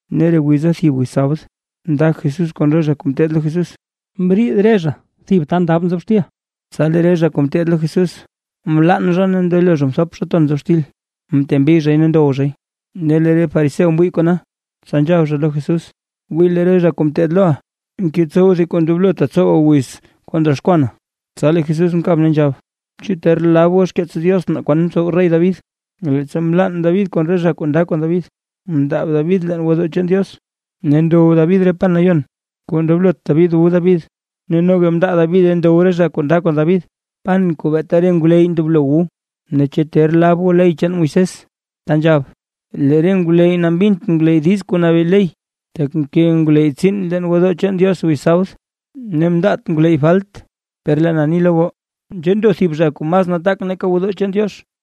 Ne re wiza thib wiz sabd, nda Jesús kon re zha kuu ngeteed lo Jesús, mriid re zha thib ta ndab xtil. Tsa lee re zha kuu ngeteed lo Jesús mlann, ne mndelo re zha mthop zha ton nzobxtil, mtembi zhay ne ndow zhay. Ne lee re fariseo mwii kona, tsa nzhab zha lo Jesús: ―Wii lee re zha kuu ngeteed loʼa, ngetsow thib kuu ndoblotaa tsowaa wiz kuu ndroxkwanaa. Tsa lee Jesús mkab ne nzhab: ―¿Chu ter lab goo xkeets Diox naa kwan mtsow rey David, leettsa mlann David kon re zha kuu nda kon David? Mndaab David leen gwodoo chaan Diox, ne ndow David re pan nayon kuu ndoblot David wu David, ne noga mndaa Davide ndow re zha kuu nda kon David, pan kuu beeta re ngwleyy ndoblo wu. Ne, ¿chu ter lab goo ley chaan Moisés ta nzhab, lee re ngwleyy mbint ngwleyy diiz kuu nabee ley, tak mke ngwleyy tsiin leen gwodoo chaan Diox wiz sabd, ne mndaat ngwleyy falt? Per lee na ni lo goo, nzhee ndo thib zha kuu mas nataak nake gwodoo chaan Diox.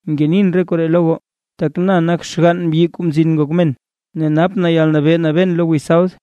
Ngenin re koree lo goo, tak na nak xgann mbyi, Kuu Mzin Ngok Men, ne napʼn yalnabee nabeen lo wiz sabd.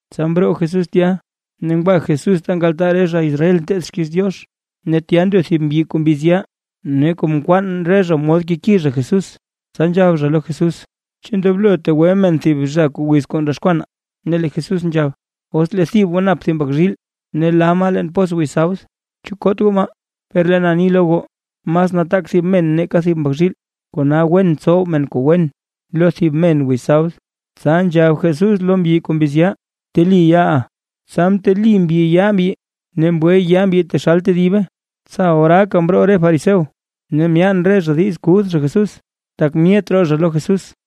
Tsa mroo Jesús tya, ne ngwa Jesús ta nkaltaa re zha Israel nteed xkiiz Diox. Ne tya ndo thib mbyi kuu mbiz yaa. Ne kom nkwaan re zha mod keki zha Jesús, tsa nzhab zha lo Jesús: ―¿Chu ndoblo tegwe men thib zha wiz kuu ndroxkwanaa? Ne lee Jesús nzhab: ―Os lee thib goo nap thib mbak zhiil ne la maa leen pos wiz sabd, ¿chu koot goo maa? Per lee na ni lo goo mas nataak thib men nake thib mbak zhiil. Kona wen tsow men kuu wen lo thib men wiz sabd. Tsa nzhab Jesús lo mbyi kuu mbiz yaa: ―Bteli yaaʼa. Tsa mteli mbyi yaa mbyi, ne mgwe yaa mbyi taxal tedibe. Tsa oraaka mroo re fariseo ne myaan re zha diiz kuth zha Jesús, tak myet roo zha lo Jesús.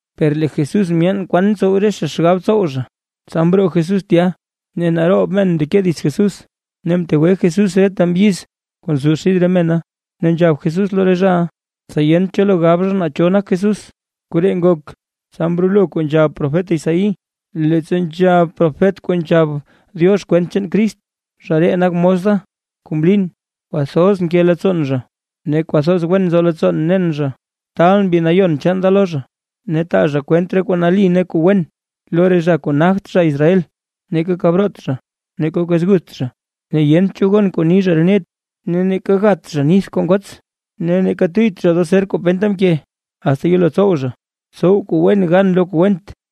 Per lee Jesús myeen naa kwan mtsow re zha xgab tsow zha. Tsa mroo Jesús tya ne naroob men mndeke dits Jesús, ne mtegwe Jesús reta mbyiz kuu nzo xid re mena. Ne nzhab Jesús lo re zhaʼa, tsa yent cho lo gab zha naa cho nak Jesús. Koree ngok, tsa mrolo kuu nzhab profet Isaí, leettsa nzhab profet kuu nzhab Diox kwent chaan Crist: Zha ree nak mos da, kuu mlin, kwathoz nke leettsoon zha, ne kwathoz wen nzo leettsoo nen zha. Taalʼn Mbi Nayon chaan da lo zha, ne taa zha kwent re kuu nali ne kuu wen lo re zha kuu nagt zha Israel. Neeka kab root zha, neeka kwez gutht zha, ne yent cho gon kuu ni zha re net. Ne neeka gat zha nith kuu ngots, ne neeka tuyyt zha doo zer kuu penta mke, asta yelo tsow zha, tsow kuu wen gan lo kuu went.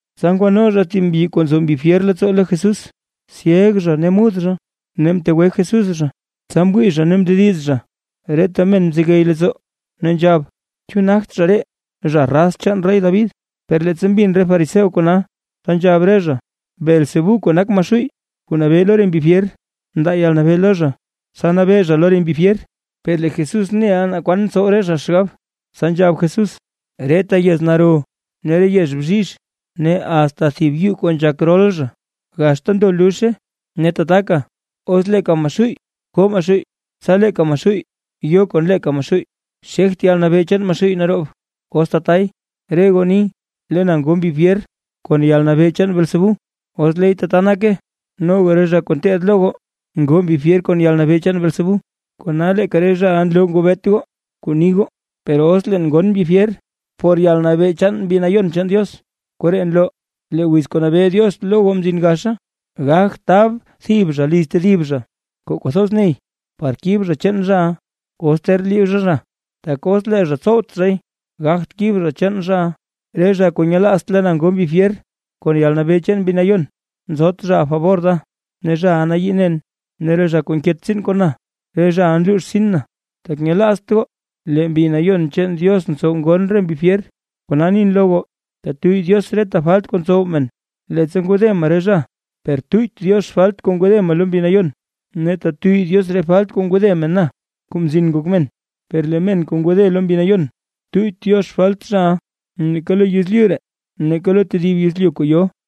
Tsa ngwano zha thib mbyi kuu nzo mbi fyer leettsoo lo Jesús, syeg zha ne mud zha. Ne mtegwe Jesús zha, tsa mwii zha ne mndediz zha. Reta men mzegey leettsoo, ne nzhab: ―¿Chu nagt zha ree, zha raz chaan rey David? Per leettsa mbin re fariseo kona, tsa nzhab re zha: ―Beelzebú kuu nak Maxuuy kuu nabee lo re mbi fyer, mndaa yalnabee lo zha, tsa nabee zha lo re mbi fyer. Per lee Jesús neʼa naa kwan ntsow re zha xgab, tsa nzhab Jesús: ―Reta yez naro ne re yez bzhizh, ne asta thib yuu kuu nzhak rol zha, gaxta ndo luzhe. Ne tataka, os leeka Maxuuy koo Maxuuy, tsa leeka Maxuuy yo kon leeka Maxuuy, xegt yalnabee chaan Maxuuy naroob, os tatay. Re goo ni lee na ngo mbi fyer kon yalnabee chaan Beelzebú, os leey tata nake, noga re zha kuu ngeteed lo goo ngoo mbi fyer kon yalnabee chaan Beelzebú. Kona leeka re zhaʼa nloo ngobeet goo kuu ni goo. Per os leen ngon mbi fyer por yalnabee chaan Mbi Nayon chaan Diox, koree nloo lee wiz kuu nabee Diox lo goo mzin gaxa. ’Gagt tab thib zha liz tedib zha kuu kwathoz ney par kib zha chaan zhaʼa, os ter liib zha zha. Tak os lee zha tsowt zhay gagt kib zha chaan zhaʼa. Re zha kuu nyelaazt lee na ngo mbi fyer kon yalnabee chaan Mbi Nayon, nzot zhaʼa fabor da ne zhaʼa nayii nen; ne re zha kuu nket tsiin kon na re zhaʼa nluux rtsin na. ’Tak nyelaazt goo lee Mbi Nayon chaan Diox ntsow ngon re mbi fyer, kona nin lo goo tetuyy Diox reta falt kuu ntsow men, leettsa ngode men re zha, per tuyyt Diox falt kuu ngode men lo Mbi Nayon. Ne tetuyy Diox re falt kuu ngode men na, Kuu Mzin Ngok Men, per lee men kuu ngode lo Mbi Nayon, tuyyt Diox falt zhaʼa, neeka lo yezlyu ree ne neeka lo tedib yezlyu kuu yo.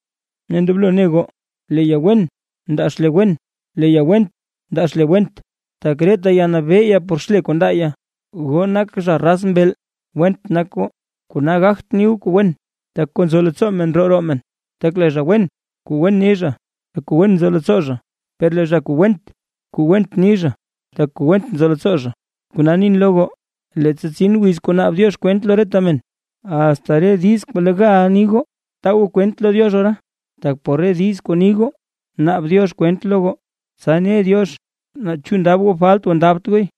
’Ne ndoblo ne goo, lee ya wen ndaa xle wen, ne lee ya went ndaa xle went, tak reta ya nabee ya por xle kuu ndaa ya. ¡Goo nak zha raz mbeel! Went nak goo, kona gagt ni goo kuu wen; tak kuu nzo leettsoo men ndroo roo men. Tak lee zha wen kuu wen ni zha, tak kuu wen nzo leettsoo zha, per lee zha kuu went kuu went ni zha, tak kuu went nzo leettsoo zha. Kona nin lo goo, leettsa tsin wiz kuu naab Diox kwent lo reta men, asta re diiz kuu legaʼa ni goo, taa goo kwent lo Diox ora. Tak por re diiz kuu ni goo naab Diox kwent lo goo, tsa ne Diox naa chu ndab goo falt o ndabt gooy.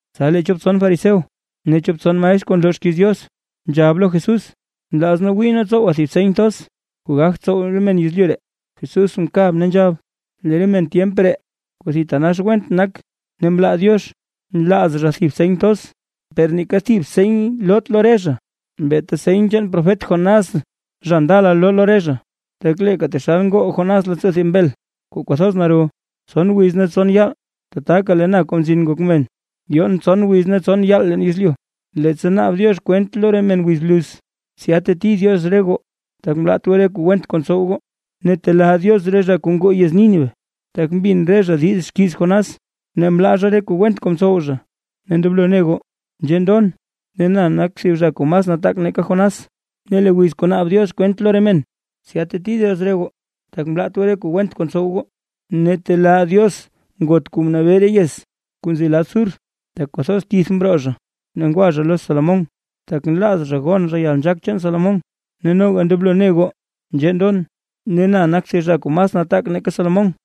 Tsa lee chop tson fariseo ne chop tson maestr kuu nloo xkiiz Diox, nzhab lo Jesús: ―Nlaaz nee wii nee tsowa thib seny thoz kuu gagt tsow re men yezlyu ree. Jesús mkab ne nzhab: ―Lee re men tyemp ree kuu thitanax went nak ne mlaa Diox, nlaaz zha thib seny thoz, per neeka thib seny loot lo re zha, beeta seny chaan profet Jonás zha ndala loo lo re zha. Tak leeka taxal ngoo Jonás leettsoo thib mbel, kuu kwathoz naro, tson wiz ne tson yaal, tataka lee na Kuu Mzin Ngok Men, yoon tson wiz ne tson yaal leen yezlyu. Leettsa naab Diox kwent lo re men wiz bluz, tsya teti Diox re goo, tak mlaat goo re kuu went kuu ntsow goo, ne telaa Diox re zha kuu ngoo yez Nínive, tak mbin re zhaʼa diiz xkiiz Jonás ne mlaa zha re kuu went kuu mtsow zha. Ne ndoblo ne goo, nzhee ndon ne na nak thib zha kuu mas nataak nake Jonás. Ne lee wiz kuu naab Diox kwent lo re men, tsya teti Diox re goo, tak mlaat goo re kuu went kuu ntsow goo, ne telaa Diox ngot kuu mnabee re yez kuu nzi lad Sur, tak kwathoz tith mroo zha ne ngwa zha lo Salomón, tak nlaaz zha gon zha yalnzhaak chaan Salomón. Ne noga ndoblo ne goo nzhee ndon ne na nak thib zha kuu masraa nataak nake Salomón.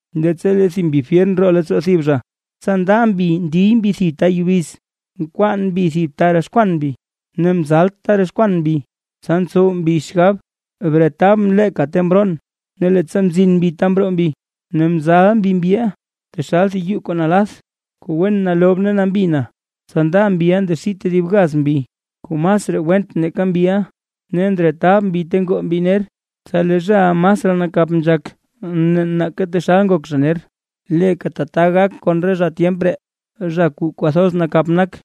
’Leettsa lee thib mbi fyer ndroo leettsoo thib zha, tsa nda mbi ndiy mbi thib ta yubiz, nkwaan mbi thib ta roxkwan mbi, ne mzalt ta roxkwan mbi, tsa ntsow mbi xgab: “Bretabʼn leeka ta mroon”. Ne leettsa mzin mbi ta mroo mbi, ne mzal mbi mbyiʼa, taxal thib yuu kuu nalath kuu wen nalob ne nambi na. Tsa nda mbiʼa ndaxii tedib gaz mbi kuu masraa went nake mbiʼa, ne ndretab mbi ta ngoo mbi ner. Tsa lee zhaʼa masraa nakap nzhak nake taxal ngok zha ner. Leeka tata gak kon re zha tyemp ree, zha kuu kwathoz nakap nak.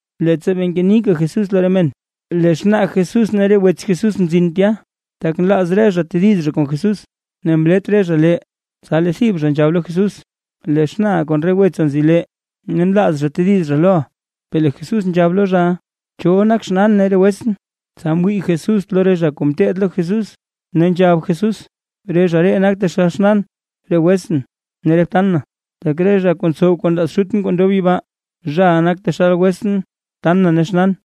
Leettsa bee ngenika Jesús lo re men, lee xnaa Jesús ne re wets Jesús mzin tya, tak nlaaz re zha tediz zha kon Jesús. Ne mlet re zha lee. Tsa lee thib zha nzhab lo Jesús: ―Lee xnaaʼa kon re wetsa nzi lee, ne nlaaz zha tediz zha loʼa. Per lee Jesús nzhab lo zhaʼa: ―¿Cho nak xnaan ne re wetsʼn? Tsa mwii Jesús lo re zha kuu ngeteed lo Jesús, ne nzhab Jesús: ―Re zha ree nak taxal xnaan ne re wetsʼn ne re btan na. Tak re zha kuu ntsow kuu nlaaz Xutʼn kuu ndob yibaa, zhaʼa nak taxal wetsʼn btan na ne xnaan.